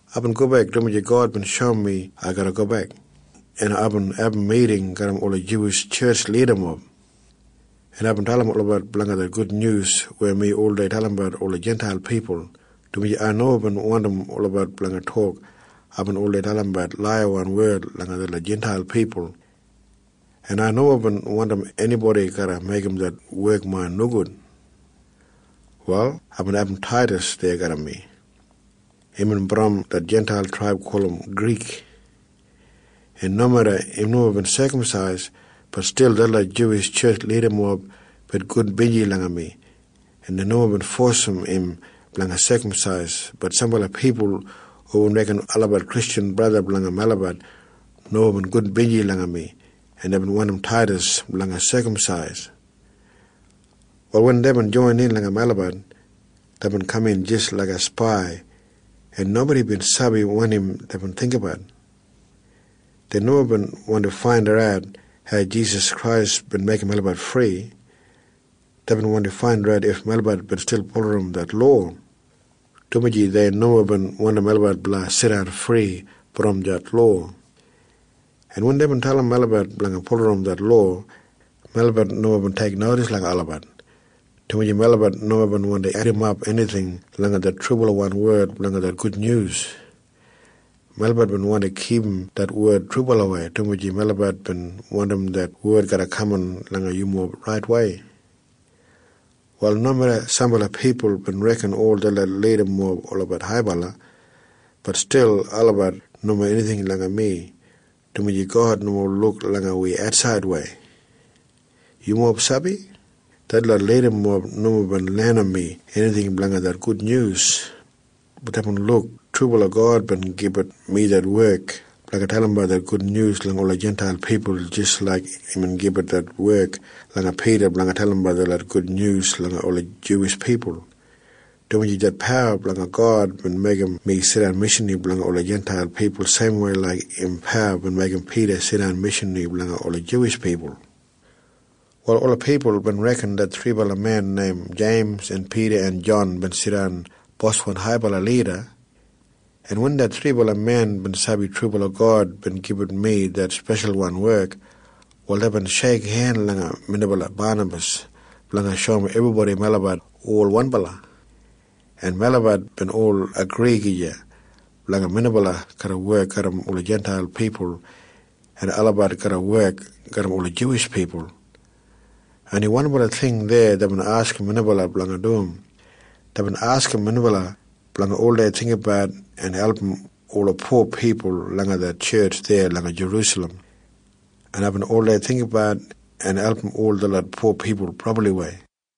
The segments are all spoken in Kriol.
Aibin gobek, dumaji God bin shoum mi ai garra gobek, en aibin abum miting garram ola Juwish tjetj lidamob, en aibin dalim olabat blanga det gudnyus weya mi oldei dalimbat ola Jintail pipul, dumaji ai nomo bin wandim olabat blanga tok aibin oldei dalimbat laiyawan wed langa detlot Jintail pipul, en ai nomo bin wandim enibodi garra meigim det wek main nogud. Wal aibin abum Taidas deya garram mi. Imbin brom det Jintail traib gulum Grik, en nomeda im nomo bin sekamsais, bat stil detlot Juwish tjetj lidamob bin gudbinji langa mi, en dei nomo bin fosim im blanga sekamsais. Bat sambala pipul hubin reken olabat Kristjan braja blanga melabat nomo bin gudbinji langa mi, en deibin wandim Taidas blanga sekamsais. Wal wen deibin joinin langa melabat, deibin kaman jis laiga spai, en nobodi bin sabi wanim deibin jinggabat. Dei nomo bin wandi faindat hau Jisas Krais bin meigim melabat fri. Deibin wandi faindat if melabat stil bulurrum det lowa, dumaji dei nomo bin wandim melabat garra jidan fri brom det lowa. En wen deibin dalim melabat blanga bulurrum det lowa, melabat nomo bin teiknodis langa olabat, dumaji melabat nomo bin wandi edimap enijing langa det trubalawan wed blanga det gudnyus. Melabat bin wandi kipum det wed trubalawei, dumaji melabat bin wandim det wed garra kaman langa yumob raitwei. Wal nomeda sambala pipul bin reken ol detlot lidamob olabat haibala, bat stil olabat nomo enijing langa mi, dumaji God nomo luk langa wi atsaidwei. Yumob sabi? Detlot lidamob nomo bin lenim mi enijing blanga det gudnyus. Bat deibin luk trubala God bin gibit mi det wek blanga dalimbat det gudnyus langa ola Jintail pipul jis laik imbin gibit det wek langa Pida blanga dalimbat det gudnyus langa ola Juwish pipul, dumaji det pawa blanga God bin meigim mi jidan speshalwan mishanri blanga ola Jintail pipul seimwei laik im pawa bin meigim Pida jidan speshalwan mishanri blanga ola Juwish pipul. Wal ola pipul bin reken det thribala men neim Jeims en Pida en Jon bin jidan boswan haibala lida. Wen det thribala men bin sabi det trubala God bin gibit mi det speshalwan wek, wal deibin sheikhen langa minbala Banabas blanga shoum ebribodi melabat ol wanbala, en melabat bin ol agri gija blanga minbala garra wek garram ola Jintail pipul en olabat garra wek garram ola Juwish pipul. Oni wanbala ting deya deibin askim minbala blanga dum. Deibin askim minbala blanga oldei jinggabat en album ola po pipul langa det tjetj deya langa Jerusalem, en aibin oldei jinggabat en album ol detlot po pipul brabliwei.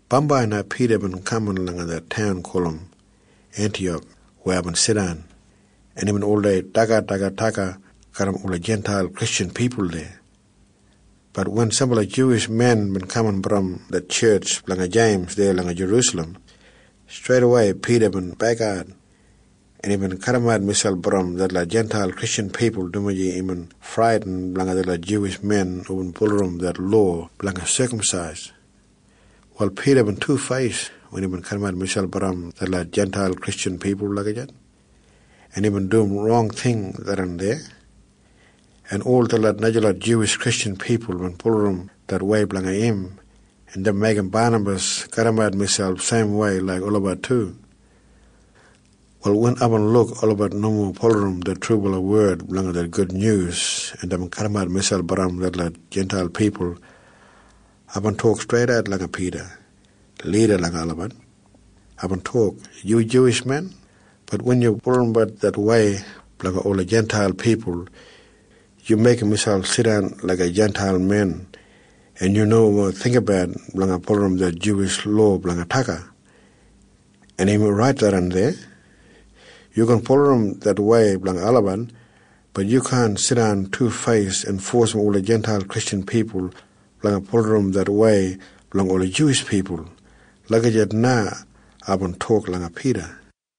Bambai na Pida bin kaman langa det taun gulum Entiyak weya aibin jidan, en imbin oldei dagadagat daga garram ola Jintail Kristjan pipul deya. Bat wen sambala Juwish men bin kaman brom det tjetj blanga Jeims deya langa Jerusalem, streidawei Pida bin bekat, en imbin kadimat miselp brom detlot Jintail Kristjan pipul, dumaji imbin bradin blanga detlot Juwish men hubin bulurrum det lowa blanga sekamsais. Wal Pida bin tufeis wen imbin kadimat miselp brom detlot Jintail Kristjan pipul lagijat, en tharran rong ting imbin dum. En ol detlot najalot Juwish Kristjan pipul bin bulurrum det wei blanga im, en deibin meigim Banabas kadimat miselp seimwei laik olabat du. Wal wen aibin luk olabat nomo bulurrum det trubala wed blanga det gudnyus en deibin kadimat miselp brom detlot Jintail pipul, aibin tok streidat langa Pida lida langa olabat. Aibin tok, “Yu Juwish men. Bat wen yu bulurrum det wei blanga ola Jintail pipul, yu meigim miselp jidan jis laiga Jintail men, en yu nomo jinggabat blanga bulurrum det Juwish lowa blanga daga. En im orait tharran deya. Yu gin bulurrum det wei blanga olabat. Bat yu kaan jidan tufeis en fosim ola Jintail Kristjan pipul blanga bulurrum det wei blanga ola Juwish pipul.” Lagijat na aibin tok langa Pida.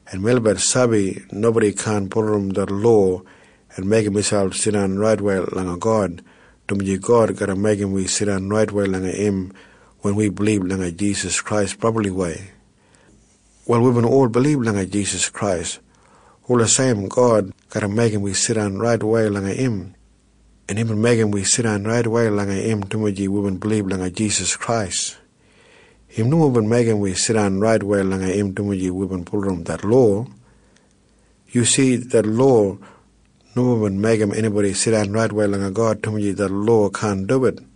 En melabat sabi nobodi kaan bulurrum det lowa en meigim miselp jidan raitwei langa God, dumaji God garra meigim wi jidan raitwei langa im wen wi bilib langa Jisas Krais brabliwei. Wal wibin ol bilib langa Jisas Krais wulijim God garra meigim wi jidan raitwei langa im, en imbin meigim wi jidan raitwei langa im dumaji wibin bilib langa Jisas Krais. Im nomo bin meigim wi jidan raitwei langa im dumaji wibin bulurrum det lowa. Yu si? Det lowa nomo bin meigim enibodi jidan raitwei langa God, dumaji det lowa kaan duwit.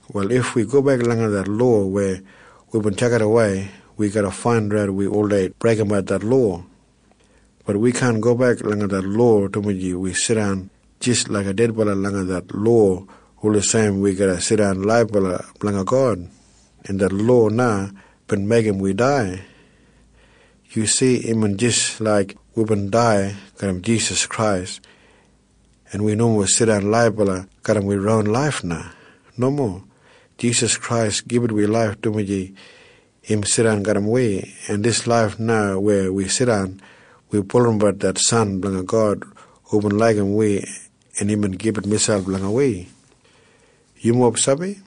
Wal if ai gobek langa det lowa weya aibin tjakidawei, ai garra faindat mi oldei breigimbat det lowa. Bat ai kaan gobek langa det lowa, dumaji mi jidan jis laiga dedbala langa det lowa wulijim ai garra jidan laibala blanga God. En det lowa na bin meigim mi dai. Yu si? Imbin jis laik aibin dai garram Jisas Krais. En mi nomo jidan laibala garram main ron laif na. Nomo. Jisas Krais gibit mi laif, dumaji im jidan garram mi, en dijan laif na weya mi jidan, ai bulurrum det San blanga God hubin laigim mi en bin gibit miselp blanga mi. Yumob sabi?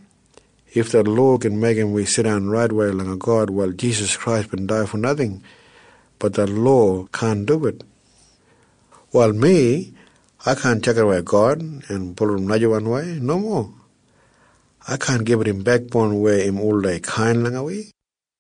If det lowa gin meigim mi jidan raitwei langa God, wal Jisas Krais bin dai fo najing. Bat det lowa kaan duwit. Wal mi, ai kaan tjakidawei God en bulurrum najawanwei. Nomo. Ai kaan gibit im bekboun weya im oldei brabli kainbala langa mi.